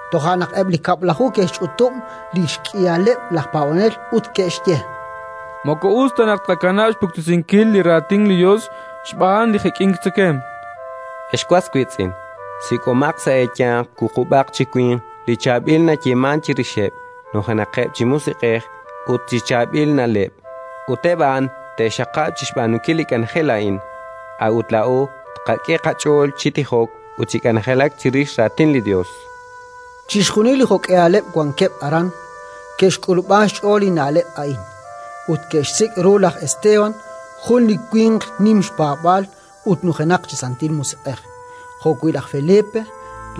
Toja' naq eb' li Kab'laju ke'xch'utub' li xk'ihaleb' laj paab'anel ut ke'xye: —Moko us ta naq tqakanab' xpuktesinkil li Raatin li Yos xb'aan li jek'ink tzekemq. Ex was wiitz'in, sik'omaq sa' eeyanq wuqub'aq chi winq li chaab'il nayeemank chirixeb', nujenaqaqeb' chi Musiq'ej ut chi chaab'il na'leb', ut eb' a'an te'qaxaqab' chi xb'aanunkil li k'anjel a'in. A'ut laa'o tqak'e qach'ool chi tijok ut chi k'anjelak chirix Raatin li Yos. Chixjunil li jo'k'ihaleb' wankeb' aran, ke'xk'ulub'an xch'ool li na'leb' a'in, ut ke'xsik' ru laj Esteban, jun li winq nim xpaab'aal ut nujenaq chi Santil Musiq'ej, jo'wi' laj Felipe,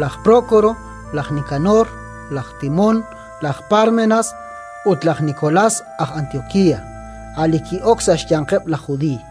laj Prókoro, laj Nikanor, laj Timón, laj Pármenas ut laj Nikolás aj Antiokía, a' li ki'ok sa' xyanqeb' laj Judiiy.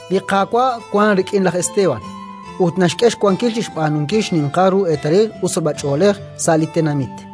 Li Qaawa' wank rik'in laj Esteban ut naxk'e xwankil chi xb'aanunkil xninqal ru eetalil ut sachb'ach'oolej sa' li tenamit.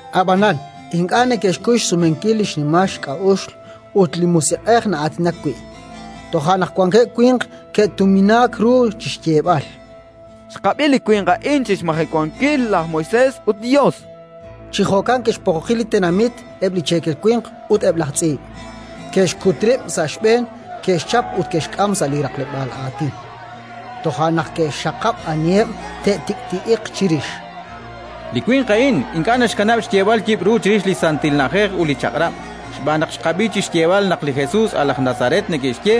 Ab'anan ink'a' neke'xkuy xsumenkil li xnimal xk'a'uxl ut li Musiq'ej na'aatinak wi'. Toja' naq wankeb' winq ke'tuminaak ru chi xyeeb'al: “Xqab'i li winq a'in chi xmajewankil laj Moisés ut li Yos”. Chi jo'kan ke'xpoqoqi li tenamit, eb' li cheekel winq ut eb' laj tz'iib'; ke'xkut rib' sa' xb'een, ke'xchap ut ke'xk'am sa' li raqleb'aal aatin. Toja' naq ke'xxaqab' aniheb' te'tik'ti'iq chirix: —Li winq a'in ink'a' naxkanab' xyeeb'al yib'ru chirix li santil na'ajej ut li Chaq'rab'. Xb'aan naq xqab'i chi xyeeb'al naq li Jesus, a' laj Nazaret neke'xye,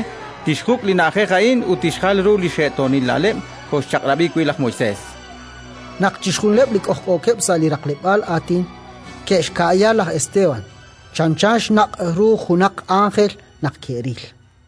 tixjuk' li na'ajej a'in ut tixjal ru li xe'toonil na'leb' kooxchaq'rab'i wi' laj Moisés, chankeb'. Naq chixjunileb' li k'ojk'ookeb' sa' li raqleb'aal aatin ke'xka'ya laj Esteban, chanchan xnaq' ru junaq ánjel naq ke'ril.